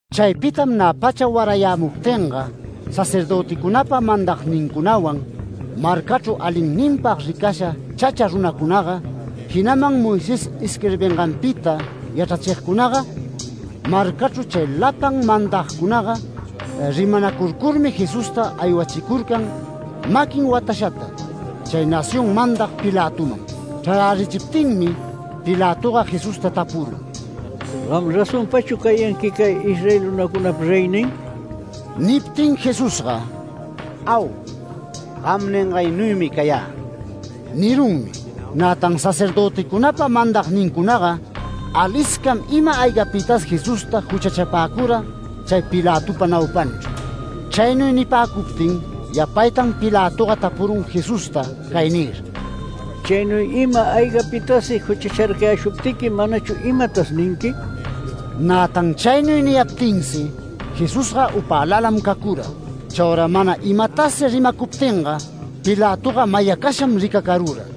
Chaypitam nä pacha warayämuptinga sacerdöticunapa mandagnincunawan, marcachru alinninpag ricasha chacha runacunaga, jinaman Moisés isquirbinganpita yachrachigcunaga, marcachru chay lapan mandagcunaga, rimanacurcurmi Jesusta aywachicurcan maquin watashata chay nación mandag Pilatoman. Chrarärichiptinmi Pilatoga Jesusta tapurun: “¿Gam razonpachu cayanqui cay Israel runacunapa reynin?” Niptin Jesusga “Au, gam ningaynuymi cayä” nirunmi. Nätan sacerdöticunapa mandagnincunaga aliscam ima-aygapitas Jesusta juchachapäcura chay Pilatopa naupanchru. Chaynuy nipäcuptin yapaytan Pilatoga tapurun Jesusta cay nir: “Chaynuy ima-aygapitas juchacharcayäshuptiqui ¿manachu imatasi ninqui?” Nätan chaynuy niyaptinsi Jesusga upälalam cacura. Chaura mana imatasi rimacuptinga Pilatoga mayacasham ricacarura.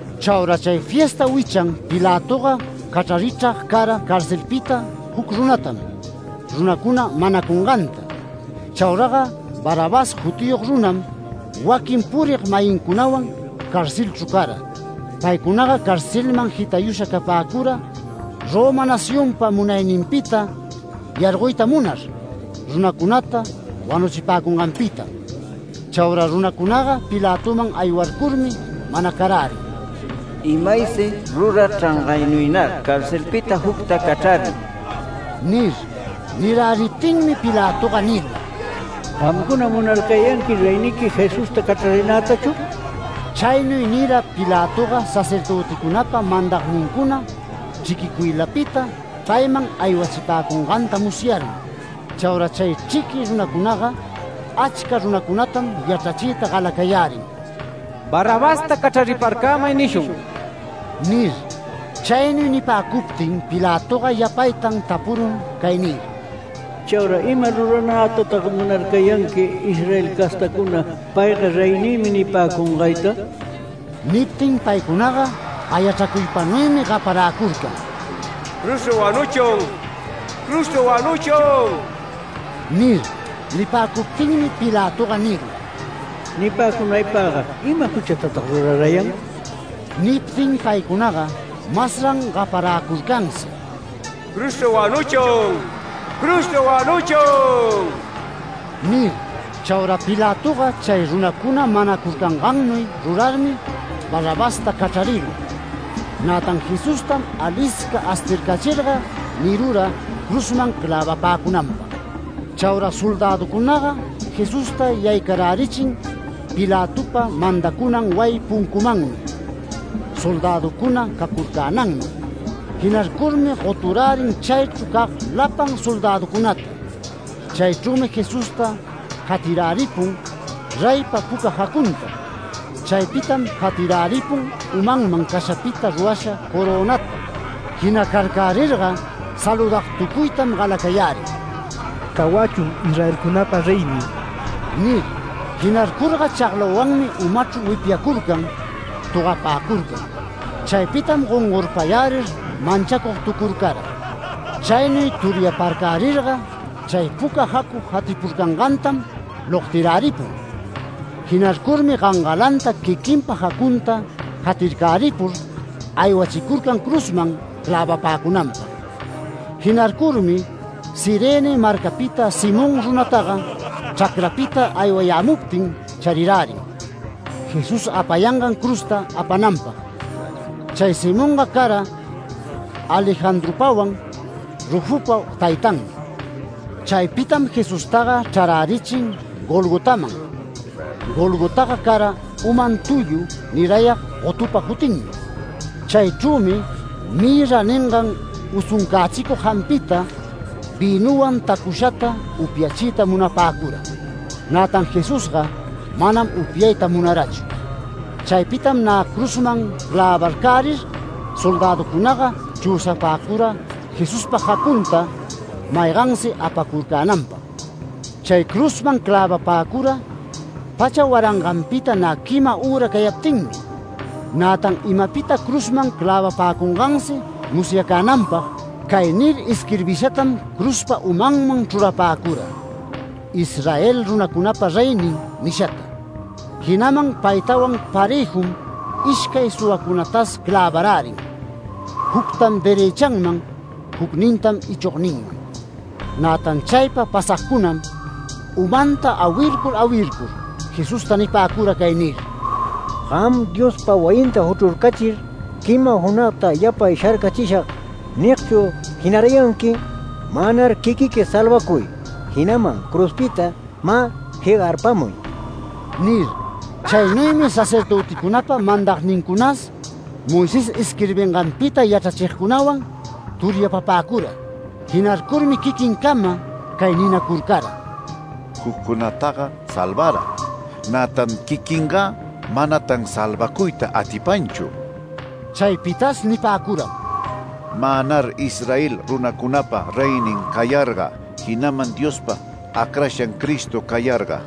Chaura chay fiesta wichan Pilatoga cachrarichrag cara carcelpita juc runatam, runacuna manacunganta. Chauraga Barrabás jutiyog runam, waquin purig-mayincunawan carcelchru cara. Paycunaga carcelman jitayusha capäcura Roma nacionpa munayninpita yargoyta munar, runacunata wanuchipäcunganpitam. Chaura runacunaga Pilatoman aywarcurmi manacarärin: “Imaysi rurachrangaynuynar carcelpita jucta cachrarï” nir. Niräriptinmi Pilatoga nirun: “¿Gamcuna munarcayanqui reyniqui Jesusta cachrarinätachu?” Chaynuy nira Pilatoga sacerdöticunapa mandagnincuna chriquicuylapita payman aywachipäcunganta musyarmi. Chaura chay chriqui runacunaga achca runacunatam yachrachiyta galacayärin, “¡Barrabasta cachrariparcämay nishun!” nir. Chaynuy nipäcuptin Pilatoga yapaytan tapurun cay nir: “¿Chaura ima ruranätatag munarcayanqui Israel castacuna ‘Payga reynïmi’ nipäcungayta?” Niptin paycunaga gayachracuypanuymi gaparäcurcan: “¡Cruzchru wanuchun! ¡Cruzchru wanuchun!” nir. Nipäcuptinmi Pilatoga nirun: “Nipäcunaypagga ¿ima juchatatag rurarayan?” Niptin paycunaga masran gaparäcurcansi: “¡Cruzchru wanuchun! ¡Cruzchru wanuchun!” nir. Chaura Pilatoga chay runacuna manacurcangannuy rurarmi Barrabasta cachrarirun, nätan Jesustam alisca astircachirga nirura cruzman clävapäcamunanpag. Chaura soldäducunaga Jesusta yaycarärichin Pilatopa mandacunan wayi puncumanmi, soldäducuna cacurcänanman. Jinarcurmi goturärin chaychru cag lapan soldäducunata. Chaychrümi Jesusta jatiräripun reypa puca jacunta. Chaypitam jatiräripun umanman cashapita rurasha corönata. Jinacarcärirga saludagtucuytam galacayärin “Cawachun Israelcunapa reynin” nir. Jinarcurga chaglawanmi umachru wipyacurcan, togapäcurcan. Chaypitam gongorpayärir manchacugtucurcara. Chaynuy turyaparcärirga, chay puca jacu jatipurcangantam logtiräripun. Jinarcurmi gangalanta quiquinpa jacunta jatircaripur aywachicurcan cruzman clävapäcunanpag. Jinarcurmi Cirene marcapita Simón runataga chracrapita aywayämuptin charirärin Jesús apayangan cruzta apananpag. Chay Simonga cara Alejandropawan Rufopa taytanmi. Chaypitam Jesustaga chrarärichin Golgotaman. (Golgotaga cara ‘Umam tullu’ nirayag gotupa jutinmi.) Chaychrümi ‘mirra’ ningan usuncächicug jampita vïnuwan tacushata upyachiyta munapäcura. Nätan Jesusga manam upyayta munarachu. Chaypitam nä cruzman clävarcärir soldäducunaga chüsapäcura Jesuspa jacunta maygansi apacurcänanpag. Chay cruzman clävapäcura pacha waranganpita nä quima üra cayaptinmi. Nätan imapita cruzman clävapäcungansi musyacänanpag, cay nir isquirbishatam cruzpa umanman chrurapäcura: “ISRAEL RUNACUNAPA REYNIN” nishata. Jinaman paytawan parëjum ishcay suwacunatas clävarärin, juctam derëchanman jucnintam ichogninman. Nätan chaypa pasagcunam umanta awircur awircur Jesusta nipäcura cay nir: “Gam ‘Diospa wayinta juchrurcachir, quima junagta yapay sharcachishag’ nigchu jinarayanqui. Mänar quiquiqui salvacuy, jinaman cruzpita mä jegarpamuy” nir. Chaynuymi sacerdöticunapa mandagnincunas, Moisés isquirbinganpita yachrachigcunawan turyapapäcura. Jinarcurmi quiquincama cay ninacurcara: “Juccunataga salvara, nätan quiquingä manatan salvacuyta atipanchu”. Chaypitas nipäcuram: “Mänar Israel runacunapa reynin cayarga, jinaman Diospa acrashan Cristo cayarga,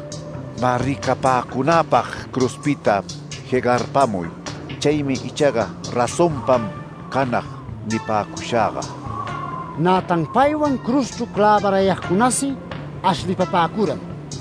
mä ricapäcunapag cruzpita jegarpamuy. Chaymi ichaga razonpam canag nipäcushagga”. Nätan paywan cruzchru clävarayagcunasi ashlipapäcuram.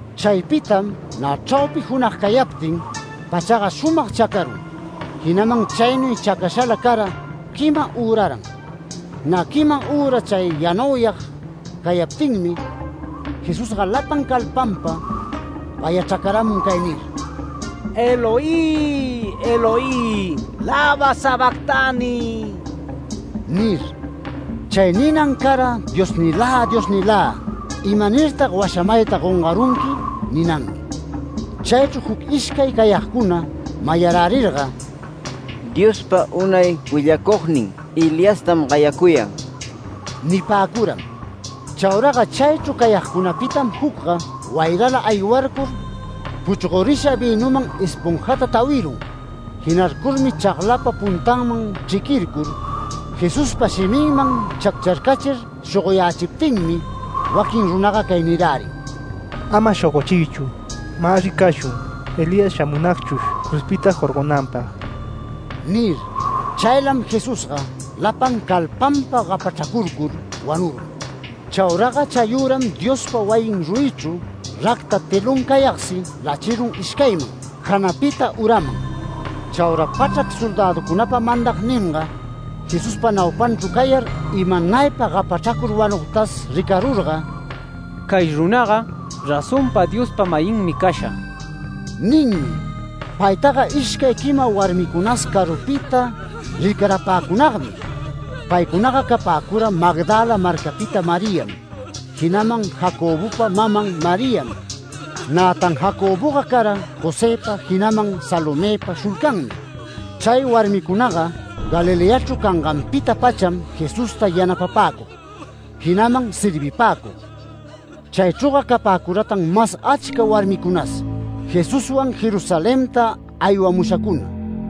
Chaypitam nä chraupi junag cayaptin, pachaga shumag chacarun, jinaman chaynuy chacashala cara quima üraran. Nä quima üra chay yanauyag cayaptinmi, Jesusga lapan calpanpa gayachracaramun cay nir: “Eloi, Eloi, ¿lama sabactani?” nir. (Chay ninan cara “Diosnilä, Diosnilä, ¿imanirtag washamayta gongarunqui?” ninanmi.) Chaychru juc ishcay cayagcuna mayarärirga “Diospa unay willacugnin Eliastam gayacuyan” nipäcuram. Chauraga chaychru cayagcunapitam jucga wayrala aywarcur puchgorisha vïnuman esponjata tawirun, jinarcurmi chaglapa puntanman chriquircur Jesuspa shiminman chaccharcachir shogoyächiptinmi waquin runaga cay nirärin: “Ama shogochiychu. Mä ricashun, Elías shamunagchush cruzpita jorgonanpag” nir. Chaylam Jesusga lapan calpanpa gapachracurcur wanurun. Chauraga chayüram Diospa wayin ruyichru racta telón cayagsi lachirun ishcayman, janapita uraman. Chauraga pachrac soldäducunapa mandagninga, Jesuspa naupanchru cayar imanaypa gapachracur wanugtas ricarurga “Cay runaga razonpa Diospa-mayinmi casha” ninmi. Paytaga ishcay quima warmicunas carupita rircarapäcunagmi. Paycunaga capäcura, Magdala marcapita Mariam, jinaman Jacobopa maman Mariam. Nätan Jacoboga cara Josëpa jinaman Salomëpa shulcanmi. Chay warmicunaga Galileachru canganpita-pacham Jesusta yanapapäcug, jinaman servipäcug. Chaychrüga capäcuratan mas achca warmicunas, Jesuswan Jerusalenta aywamushacuna.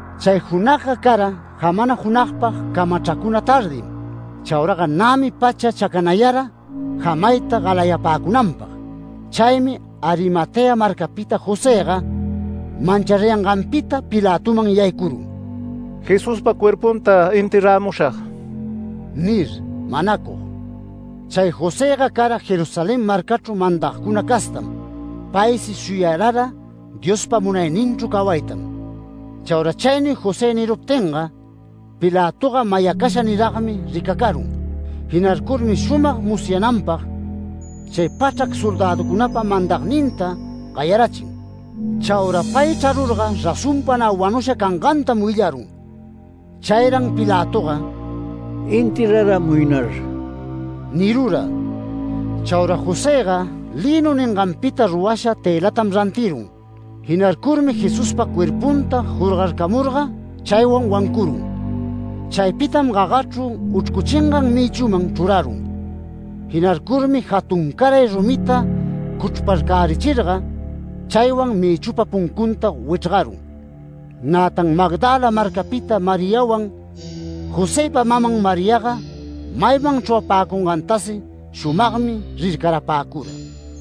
Chay junagga cara, jamana junagpag camachracuna tardim. Chauraga nämi pacha chacanayara jamayta galayapäcunanpag. Chaymi Arimatea marcapita Josëga manchariyanganpita Pilatoman yaycurun “Jesuspa cuerpunta enterramushag” nir, manacug. Chay Josëga cara Jerusalén marcachru mandagcuna castam. Paysi shuyarara Diospa munayninchru cawaytam. Chaura chaynuy José niruptinga Pilatoga mayacasha niragmi ricacarun. Jinarcurmi shumag musyananpag chay pachrac soldäducunapa mandagninta gayarachin. Chaura pay chrarurga razonpa nä wanusha cangantam willarun. Chayran Pilatoga “Enterraramuynar” nirura. Chaura Josëga lïnu ninganpita rurasha tëlatam rantirun. Jinarcurmi Jesuspa cuerpunta jorgarcamurga chaywan wancurun. Chaypitam gagachru uchrcuchingan mïchuman chrurarun. Jinarcurmi jatuncaray rumita cuchrparcachirga chaywan mïchupa puncunta wichrgarun. Nätan Magdala marcapita Mariawan, Josëpa maman Mariaga mayman chrurapäcungantasi shumagmi rircarapäcura.